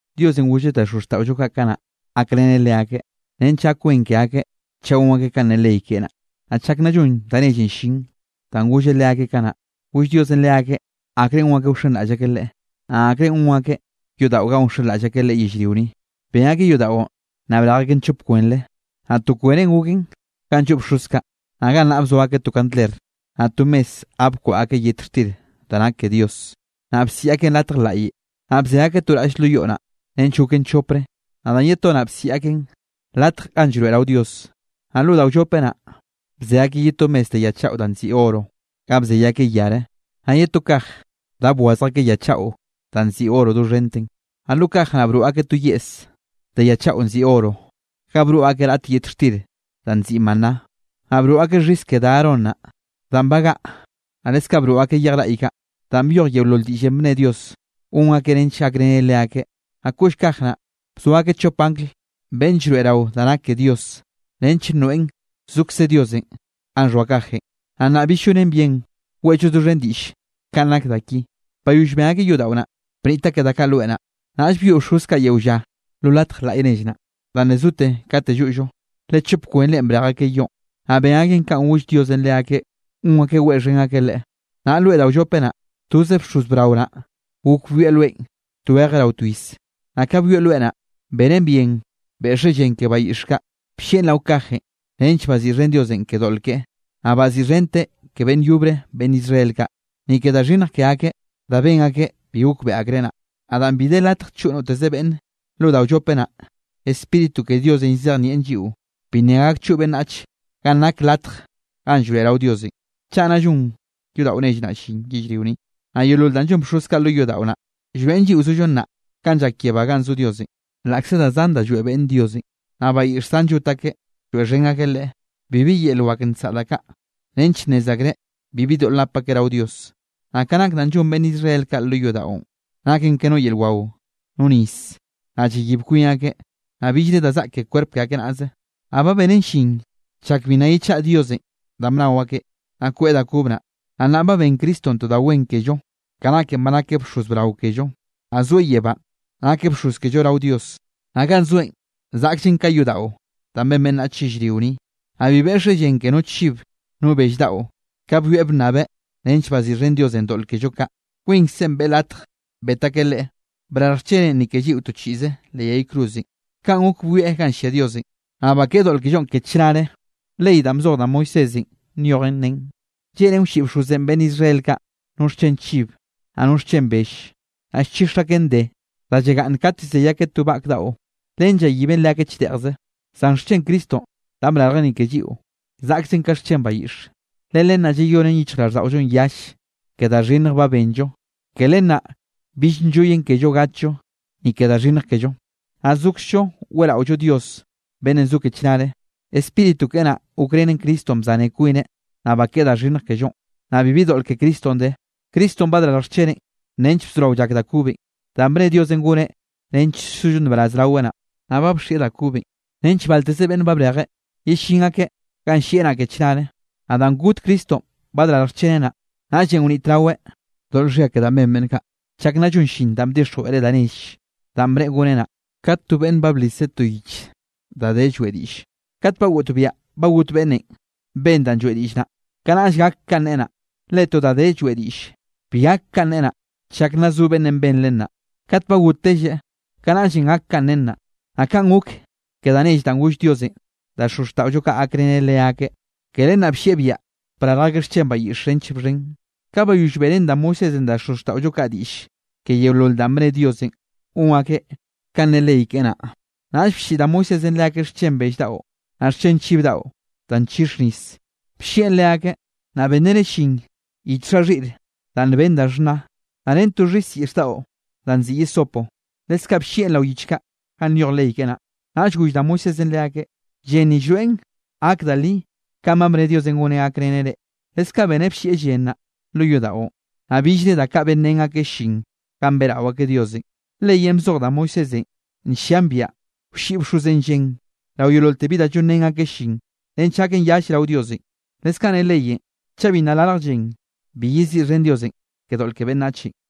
Diosenꞌ golleꞌ da xozxtaꞌollo kaꞌ kanaꞌ, gakreneꞌ leakeꞌ nench gak wen ke akeꞌ chaꞌ gon akeꞌ kanꞌ ne ley keꞌe naꞌ. Naꞌ chak nna llon da nellenꞌ llin, danꞌ golleꞌ leakeꞌ kanaꞌ, goll Diosenꞌ leakeꞌ akrenꞌ gon akeꞌ wxenraꞌll akeꞌ Leꞌe, naꞌ akrenꞌ gon akeꞌ yodaꞌo ganꞌ wxenraꞌll akeꞌ Leꞌe yellrio ni. Ben akeꞌ yodaꞌon, naꞌ brej akeꞌn chop kwenre, naꞌ to kwenen goken ganꞌ lloꞌ bxoz kaꞌ, naꞌ gannaꞌ bzoa akeꞌ to kandler, naꞌ to mes ga bkwaꞌa akeꞌ yet xtir da nak ke Dios. Naꞌ bsiꞌi akeꞌn Latj Laꞌye. Naꞌ bze akeꞌ to raꞌll lo yoꞌ naꞌ, nench goken chopre, naꞌ danꞌ ye to naꞌ, bsiꞌi akeꞌn Latj ganꞌ Llroeꞌrao Dios. Naꞌ lo da wllope naꞌ, bze akeꞌ ye to mes de ya chaꞌo danꞌ nziꞌi oro, ga bzey akeꞌ yare, naꞌ ye to kaj da bwazj akeꞌ ya chaꞌo danꞌ nziꞌi oro doxhente. Naꞌ lo kaj naꞌ broꞌ akeꞌ to yeꞌs de ya chaꞌo nziꞌi oro, ga broꞌ akeꞌ raꞌt yet xtir danꞌ nziꞌi maná, naꞌ broꞌ akeꞌ xhis ke da Aarón naꞌ, danꞌ bagaꞌa. Naꞌ leskaꞌ broꞌ akeꞌ yej raꞌy kaꞌ, danꞌ byoj yeolol diꞌllenꞌ bne Diosenꞌ gon akeꞌ nench gakreneꞌ leakeꞌ. Naꞌ koꞌll kaj naꞌ, bzoa akeꞌ chop angl beꞌnn llroeꞌrao da nak ke Dios, nench nroeꞌn zokze Diosenꞌ ganꞌ xhoa kajenꞌ. Naꞌ nnaꞌ bi llonen bien weꞌllo doxhen diꞌll kanꞌ nak da ki. Bayoll ben akeꞌ yodaꞌo naꞌ, bniꞌt akeꞌ da kaꞌ loe naꞌ, naꞌll byoꞌ bxoz kaꞌ yeo lla lo latj laꞌy nell naꞌ, danꞌ le zote kate lloꞌllo, le chop kwenrenꞌ brej akeꞌ yoꞌn, naꞌ ben akeꞌ kanꞌ goll Diosenꞌ leakeꞌ gon akeꞌ weꞌxhen akeꞌ Leꞌe. Naꞌ loe da wllope naꞌ, toze bxoz brao naꞌ gok byoeꞌ loenꞌ tweje rao twiz. Naꞌ ka byoeꞌ loe naꞌ, benen bien beꞌxeꞌ llen ke bayiꞌx kaꞌ, bllieꞌn rao kajenꞌ nench baziꞌxhen Diosenꞌ ke doꞌl keꞌe, naꞌ baziꞌxhenteꞌ ke beꞌnn yobre beꞌnn Israel kaꞌ, ni ke da xhinnj ke akeꞌ danꞌ ben akeꞌ bi gokbeꞌe akreꞌ naꞌ. Naꞌ danꞌ bi de latj choꞌ noteze beꞌnne lo da wllope naꞌ, Spíritu ke Diosenꞌ llzejnieꞌn lliꞌo, bi nna gak choꞌ beꞌnnach ganꞌ nak Latj ganꞌ Llroeꞌrao Diosenꞌ, chaꞌ nna llon yodaꞌo nell naꞌ llin yellrio ni. Naꞌ yeolol danꞌ llon bxoz kaꞌ lo yodaꞌo naꞌ, llroeꞌn lliꞌo zollo nnaꞌ kanꞌ llak yebá ganꞌ zo Diosenꞌ. Laꞌkze da zan da lloeꞌ beꞌnne Diosenꞌ, naꞌ bayiꞌx zan llot akeꞌ lloeꞌxhen akeꞌ Leꞌe, bibi yel wak nsaꞌa da kaꞌ nench nnez akreꞌ bibi doꞌl nap akeꞌ rao Dios. Naꞌ ka nak danꞌ llon beꞌnn Israel kaꞌ lo yodaꞌon, naken ke no yel wao, no nis, naꞌ llayib kwin akeꞌ, naꞌ billre da zaꞌk ke kwerp ke akeꞌ naꞌze. Naꞌ ba benen llin chak bi nna yechaꞌa Diosenꞌ danꞌ bnao akeꞌ, naꞌ koeꞌ da kob naꞌ. Naꞌ nnaꞌ ba ben Cristonꞌ to da wen kello, ka naken ba nakeꞌ bxoz brao kello. Naꞌ zoeꞌ yebánꞌ nakeꞌ bxoz kello rao Dios, naꞌ ganꞌ zoeꞌn zaꞌkllen ka yodaꞌo da ben beꞌnnach yellrio ni. Naꞌ bi beꞌxeꞌ llen ke no chib no bell daꞌo, kanꞌ byoeꞌ bnnabeꞌ nench baziꞌxhen Diosenꞌ doꞌl kello kaꞌ, kwinkzeꞌ beꞌe latj bet akeꞌ Leꞌe, brarj xcheneꞌn ni ke lliꞌo to chiꞌze leꞌ yay cruzenꞌ, kaꞌn gok byoeꞌ ganꞌ llia Diosenꞌ, naꞌ bakeꞌe doꞌl kellonꞌ ke chnare. Ley danꞌ bzoj da Moisésenꞌ nyojen, nen lleꞌnen wlliꞌ bxozenꞌ beꞌnn Israel kaꞌ no xchen chib, naꞌ no xchen bell, naꞌ llchix akeꞌn de, da llagaꞌnn kat llzey akeꞌ to vak daꞌo. Len llayiben leakeꞌ chdeꞌjze. Zan xchen Cristonꞌ danꞌ badrarjeꞌ ni ke lliꞌo, zaꞌkllen ka xchen bayiꞌxe, le len naꞌ llayonen yichjraꞌlldaꞌollonꞌ yall ke da xhinnj ba benllo. Ke len naꞌ bill nlloy kellonꞌ gatllo ni ke da xhinnj kello, naꞌ sokzllo weꞌraollo Dios beꞌnnenꞌ zo ke chnare. Spíritu keꞌe naꞌ gokrenen Cristonꞌ bzaneꞌ kwineꞌ, naꞌ bakeꞌe da xhinnj kellonꞌ, naꞌ bibi doꞌl ke Cristonꞌ de. Cristonꞌ badrarj xcheneꞌn nench bzorao llak da kobenꞌ, danꞌ bne Diosenꞌ goneꞌ nench sollo nbaraz raweꞌ naꞌ. Naꞌ ba bxieꞌ da kobenꞌ nench balteze beꞌnnenꞌ ba brejeꞌ, yellín akeꞌ ganꞌ llieꞌ naꞌ ke chnare. Naꞌ danꞌ got Cristonꞌ badrarj xcheneꞌ naꞌ, naꞌllenꞌ wnitraweꞌ doꞌl xhia ke danꞌ ben beꞌnn kaꞌ, chak nna llon llin danꞌ bdixjweꞌreꞌ da nell, danꞌ bneꞌe goneꞌ naꞌ. Kat to beꞌnne ba bliseꞌ to yich da de lloeꞌ diꞌlle, kat ba goꞌtbiaꞌ ba got beꞌnnenꞌ ben danꞌ lloeꞌ diꞌll naꞌ, kanaꞌll gak kanꞌ nen naꞌ. Le to da de lloeꞌ diꞌll, bi gak kanꞌ nen naꞌ, chak nna zo beꞌnnenꞌ ben len naꞌ. Kat ba gottelleꞌ, kanaꞌllenꞌ gak kanꞌ nen naꞌ. Naꞌ kaꞌn gok ke da nell danꞌ goll Diosenꞌ da xozxtaꞌollo kaꞌ gakreneꞌ leakeꞌ. Ke len naꞌ bllieꞌ biaꞌa brarj akeꞌ xchen bayiꞌx nench bxhen. Ka bayoll beꞌrén da Moisésenꞌ da xozxtaꞌollo kaꞌ diꞌll ke yeolol danꞌ bne Diosenꞌ gon akeꞌ kanꞌ ne ley keꞌe naꞌ, naꞌll blliꞌ da Moisésenꞌ leakeꞌ xchen bell daꞌo, naꞌ xchen chiv daꞌo danꞌ nchix nis. Bllieꞌn leakeꞌ, naꞌ benreneꞌ llin yich xha xhiꞌre da nben da xhna, naꞌ ren to xhis yiꞌx daꞌo danꞌ nziꞌi hisopo. Leskaꞌ bllieꞌn rao yich kaꞌ ganꞌ nyoj ley keꞌe naꞌ. Naꞌll goll da Moisésenꞌ leakeꞌ: “Llen ni llroeꞌn gaken da li kanꞌ ba bne Diosenꞌ goneꞌ gakreneꞌ reꞌ.” Leskaꞌ beneꞌ bllieꞌ llen naꞌ, lo yodaꞌon, naꞌ billre da kaꞌ benrén akeꞌ llin ganꞌ beꞌrao akeꞌ Diosenꞌ. Leyenꞌ bzoj da Moisésenꞌ nllian biaꞌa wlliꞌ bxozenꞌ llen rao yeololte bi da llonrén akeꞌ llin, nench gaken yall rao Diosenꞌ. Leskaꞌ ne leyenꞌ chaꞌ bi nna larj llen, bi yeziꞌxhen Diosenꞌ ke doꞌl ke beꞌnnachenꞌ.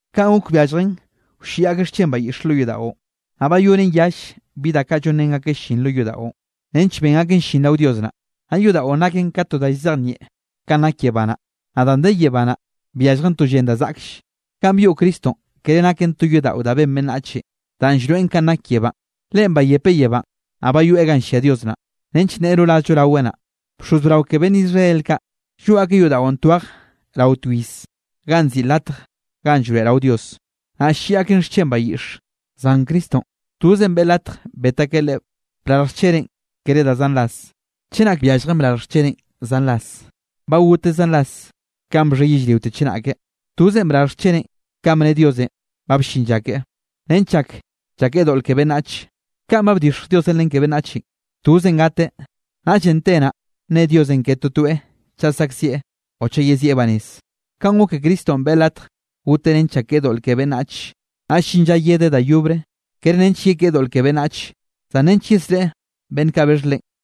Kaꞌn gok byalljen wlliꞌ akeꞌ xchen bayiꞌx lo yodaꞌon, naꞌ bayonen yall bi da kaꞌ llonrén akeꞌ llin lo yodaꞌon, nench ben akeꞌ llin rao Dios naꞌ, naꞌ yodaꞌon naken ka to da llzejnieꞌn kanꞌ nak yebá naꞌ. Naꞌ danꞌ de yebá naꞌ, byalljen to llen da zaꞌkll. Ganꞌ byoꞌ Cristonꞌ kere naken to yodaꞌo da ben beꞌnnach, danꞌ llroeꞌ kanꞌ nak yebánꞌ. Leꞌen bayepeꞌ yebánꞌ, naꞌ bayoeꞌ ganꞌ llia Dios naꞌ, nench nneꞌe rorazllo raweꞌ naꞌ. Bxoz brao ke beꞌnn Israel kaꞌ, lloꞌ akeꞌ yodaꞌon twej rao to iz ganꞌ nziꞌi Latj ganꞌ Llroeꞌrao Dios, naꞌ ll-lliꞌ akeꞌn xchen bayiꞌxe, zan Cristonꞌ tozenꞌ beꞌe latj bet akeꞌ Leꞌe brarj xcheneꞌn kere da zan ras. Chenak byalljen brarj xcheneꞌn zan ras, ba goteꞌ zan ras kanꞌ bxhe yellriote chenake. Tozenꞌ badrarj xcheneꞌn kanꞌ bne Diosenꞌ ba bllin lla keꞌe, nench llak llakeꞌe doꞌl ke beꞌnnach. Kanꞌ ba bdixj Diosenꞌ len ke beꞌnnachenꞌ, tozenꞌ gateꞌ, naꞌll te naꞌ nne Diosenꞌ ke totoeꞌ chaꞌ saꞌkziꞌe o chaꞌ yezieꞌ banez. Kaꞌn gok ke Cristonꞌ beꞌe latj goteꞌ nench llakeꞌe doꞌl ke beꞌnnach. Naꞌll llin lla yedeꞌ da yobre, kere nench yekeꞌe doꞌl ke beꞌnnach, zan nench yesreꞌe beꞌnn kaꞌ bexh Leꞌen.